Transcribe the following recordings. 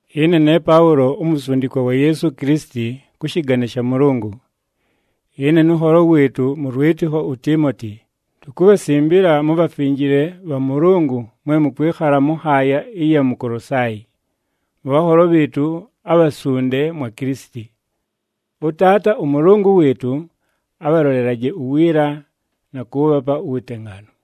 Ɨne ne Paʉlo, umusundikwa wa Yeesu Kilisiti kʉ shɨgane sha Mʉlʉngʉ. Ɨne nʉ nholo wɨɨtʉ mʉ lwɨtɨkho uTiimoti, tukubhasimbila mubhafinjile bha Mʉlʉngʉ mwe mʉkwɨkhala mʉ nhaaya ɨya mu Kolosaayi, mʉ bhanholo bhɨɨtʉ abhasunde mwa Kilisiti. ɄTaata ʉMʉlʉngʉ wɨɨtʉ, abhalolelaje uwiila, na kʉʉbhapa uwutengaanu.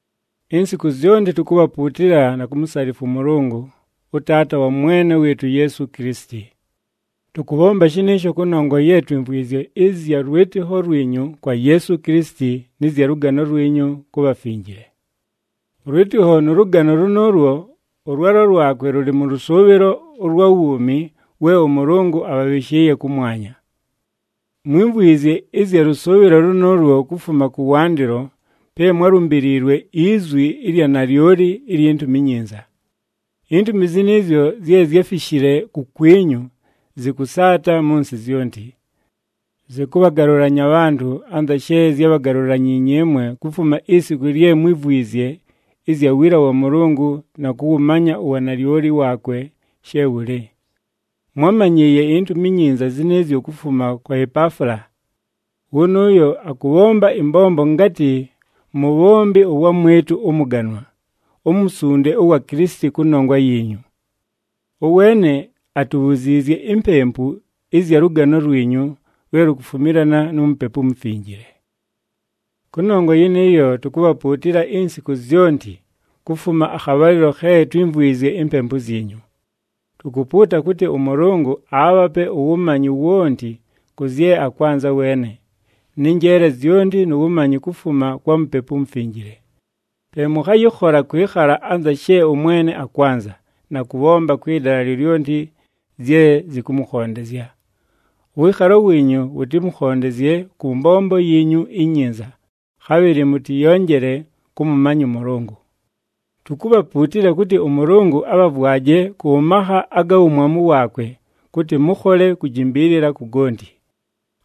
Insiku zyonti tukubhapuutila na kumusalifwa ʉMʉlʉngʉ, ʉTaata wa Mwene wɨɨtʉ uYeesu Kilisiti. Tʉkʉbhomba shɨnɨɨsho kʉnongwa ye twimvwizye ɨzya lwɨtɨkho lwinyu kwa Yeesu Kilisiti nɨ zya lʉgano lwinyu ku bhafinjile. Ʉlwɨtɨkho nʉ lʉgano lʉnʉʉlwo, ʉlwalo lwakwe lʉlɨ mʉ lʉsʉʉbhɨlo ʉlwa wuumi we ʉMʉlʉngʉ abhabhɨshɨɨye kʉmwanya. Mwímvwizye ɨzya lʉsʉʉbhɨlo lʉnʉʉlwo kufuma kʉwandɨlo pe mwálumbiliilwe izwi ɨlya nalyoli ilyi Ntumi iNyinza. Intumi zɨnɨɨzyo zye zyáfishile kukwinyu, zɨkʉsaata mʉ nsɨ zyonti. Zɨkʉbhagalʉlanya abhantʉ anza she zyábhagalulanyiinye ɨmwe kufuma isiku lye mwívwizye ɨzya wiila wa Mʉlʉngʉ na kʉwʉmanya uwanalyoli waakwe she wʉlɨ. Mwámanyɨɨye iNtumi iNyinza zɨnɨɨzyo kufuma kwa Epaafula. Wʉnʉʉyo akʉbhomba ɨmbombo ngatɨ mubhombi ʉwamwɨtʉ ʉmʉganwa, umusunde ʉwa Kilisiti kʉnongwa yiinyu. Ʉweene atubhuziizye impempu ɨzya lʉgano lwinyu lwe lukufumilana nu Mupepu uMufinjile. Kʉnongwa yɨnɨɨyo, tukubhapuutila insiku zyonti kufuma akhabhalɨlo khe twímvwizye impempu zyinyu. Tukupuuta kʉtɨ ʉMʉlʉngʉ aabhape uwumanyi wonti kʉ zye akwanza weene, nɨ njeele zyonti nu wumanyi kufuma kwa Mupepu uMufinjile. Pe mʉkhayɨkhola kwɨkhala anza she ʉMwene akwanza, na kʉbhomba kwɨ dala lyolyonti zye zɨkʉmʉkhondezya. Ʉwɨɨkhalo wiinyu wʉtɨmʉkhondezye kʉ mbombo yiinyu inyinza, khabhɨlɨ mʉtɨyonjele kʉmʉmanya ʉMʉlʉngʉ. Tukubhapuutila kʉtɨ ʉMʉlʉngʉ abhavwaje kʉ makha aga wumwamu waakwe kʉtɨ mʉkhole kujimbiilila ku gonti.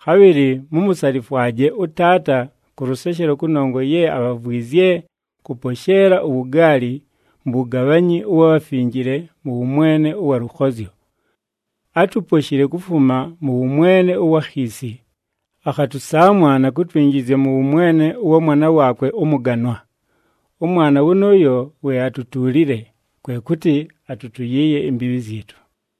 Khabhɨlɨ mumusalifwaje ʉTaata kʉ lʉseshelo kʉnongwa ye abhavwizye kʉposheela uwugaali mu wugabhanyi ʉwa bhafinjile mʉ wʉmwene ʉwa lʉkhozyo. Átuposhile kufuma mʉ wʉmwene ʉwa khiisi, akhatʉsaamwa na kutwinjizya mʉ wʉmwene ʉwa Mwana waakwe ʉmʉganwa. ɄMwana wʉnʉʉyo we atutuulile, kwe kʉtɨ atʉtʉyɨɨye imbiibhi zyɨtʉ.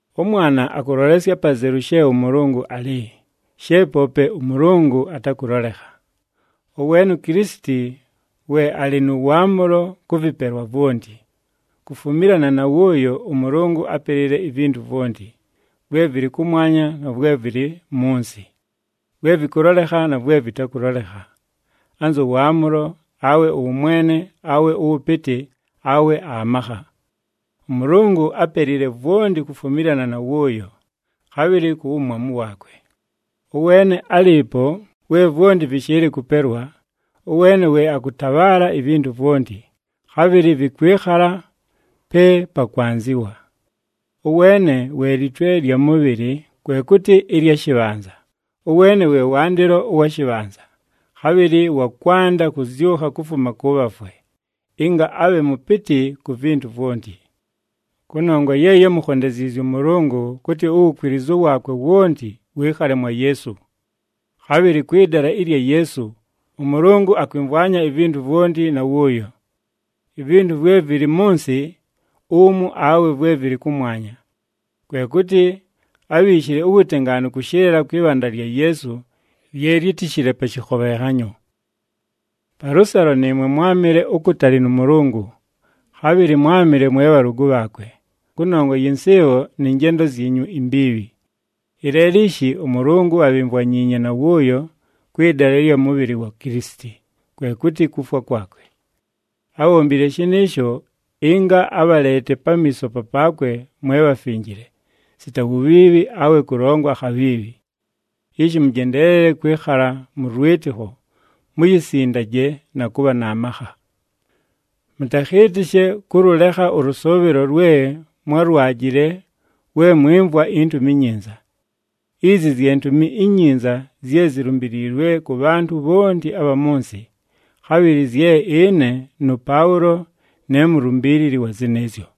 ɄMwana akʉlolesya apazelu she ʉMʉlʉngʉ alɨ, she poope ʉMʉlʉngʉ atakʉlolekha. Ʉweene uKilisiti we alɨ nʉ waamʉlo kʉ vɨpelwa vwonti. Kufumilana na wʉʉyo, ʉMʉlʉngʉ ápelile ivintu vwonti, vwe vɨlɨ kʉmwanya na vwe vɨlɨ mʉ nsɨ, vwe vɨkʉlolekha na vwe vɨtakʉlolekha, anzʉ waamʉlo, awe ʉwʉmwene, awe ʉwʉpɨtɨ, awe amakha. ɄMʉlʉngʉ ápelile vwonti kufumilana na wʉʉyo, khabhɨlɨ ku wumwamu waakwe. Ʉweene álɨɨpo we vwonti vɨshɨɨlɨ kʉpelwa, ʉweene we akʉtabhaala ivintu vwonti, khabhɨlɨ vɨkwɨkhala pe pakwanzɨwa. Ʉweene we litwe lya mʉbhɨlɨ, kwe kʉtɨ ɨlya shɨbhanza, ʉweene we wandɨlo ʉwa shɨbhanza, khabhɨlɨ wa kwanda kʉzyʉkha kufuma kʉ bhafwe, ɨnga abhe mʉpɨtɨ ku vintu vwonti. Kʉnongwa ye yámukhondeziizye ʉMʉlʉngʉ kʉtɨ uwukwilizu waakwe wonti wɨɨkhale mwa Yeesu. Khabhɨlɨ kwɨ dala ɨlya Yeesu, ʉMʉlʉngʉ akwɨmvwanya ivintu vwonti na wʉʉyo, ivintu vwe vɨlɨ mʉ nsɨ umu awe vwe vɨlɨ kʉmwanya. Kwe kʉtɨ ábhiishile uwutengaanu kʉshɨlɨla kwɨ bhanda lya Yeesu, lye lyítishile pa shɨkhobhenhanyo. Palʉsalo nɨɨmwe mwámɨle ukutali nʉ Mʉlʉngʉ, khabhɨlɨ mwámɨle mwe bhalʉgʉ bhaakwe, kʉnongwa yɨ nsɨɨbho nɨ njendo zyinyu imbiibhi. Ɨleelo ishi ʉMʉlʉngʉ abhimvwanyiinye na wʉʉyo kwɨ dala ɨlya mʉbhɨlɨ wa Kilisiti, kwe kʉtɨ kufwa kwakwe. Ábhombile shɨnɨɨsho ɨnga abhaleete pamiiso papaakwe mwe bhafinjile, sita wubhiibhi awe kʉlongwa akhabhiibhi. Ishi mʉjendeelele kwɨkhala mʉ lwɨtɨkho, muyisindaje na kʉbha na makha. Mʉtakhɨɨtɨshe kʉlʉlekha ʉlʉsʉʉbhɨlo lwe mwálwajile we mwɨmvwa iNtumi iNyinza. Izi zye Ntumi iNyinza zye zilumbiliilwe kʉ bhantʉ bhonti abha mʉ nsɨ, khabhɨlɨ zye ɨne nʉPaʉlo ne mulumbiilili wa zɨnɨɨzyo.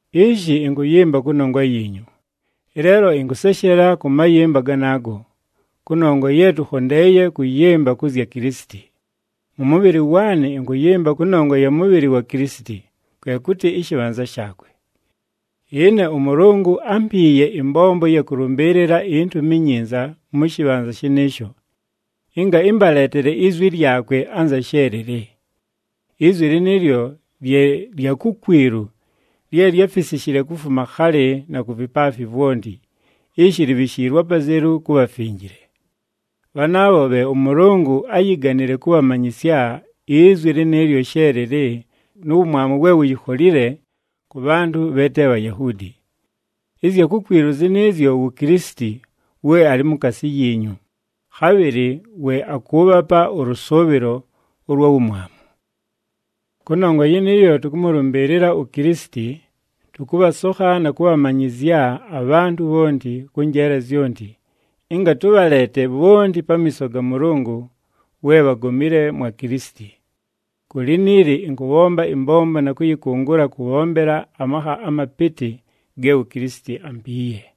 Ishi ɨnkʉyɨmba kʉnongwa yiinyu. Ɨleelo ɨnkʉseshela kʉ mayɨmba ganaago, kʉnongwa ye tʉkhondeeye kʉyɨmba kʉ zya Kilisiti. Mʉ mʉbhɨlɨ waanɨ ɨnkʉyɨmba kʉnongwa ya mʉbhɨlɨ wa Kilisiti, kwe kʉtɨ ɨshɨbhanza shaakwe. Ɨne ʉMʉlʉngʉ ámpiiye ɨmbombo ɨya kʉlʉmbɨɨlɨla iNtumi iNyinza mʉ shɨbhanza shɨnɨɨsho, ɨnga ɨmbaleetele izwi lyakwe anza she lɨlɨ. Izwi lɨnɨɨlyo lye lya kukwilu lye lyáfisishile kufuma khalɨ na ku vipaafi vwonti, ishi libhishiilwe apazelu ku bhafinjile. Bhanaabho bhe ʉMʉlʉngʉ áyiganile kʉbhamanyɨsya izwi lɨnɨɨlyo she lɨlɨ nu wumwamu we wuyikholile kʉ bhantʉ bhe te Bhayahuudi. Ɨzya kukwilu zɨnɨɨzyo wu Kilisiti we alɨ mukaasi yiinyu, khabhɨlɨ we akʉʉbhapa ʉlʉsʉʉbhɨlo ʉlwa wumwamu. Kʉnongwa yɨnɨɨyo, tʉkʉmʉlʉmbɨɨlɨla uKilisiti, tʉkʉbhasokha na kʉbhamanyɨzya abhantʉ bhonti kʉ njeele zyonti, ɨnga tʉbhaleete bhonti pamiiso ga Mʉlʉngʉ we bhagomile mwa Kilisiti. Ku liniili ɨnkʉbhomba ɨmbombo na kʉyɨkʉngʉla kʉbhombela amakha amapɨtɨ ge uKilisiti ampiiye.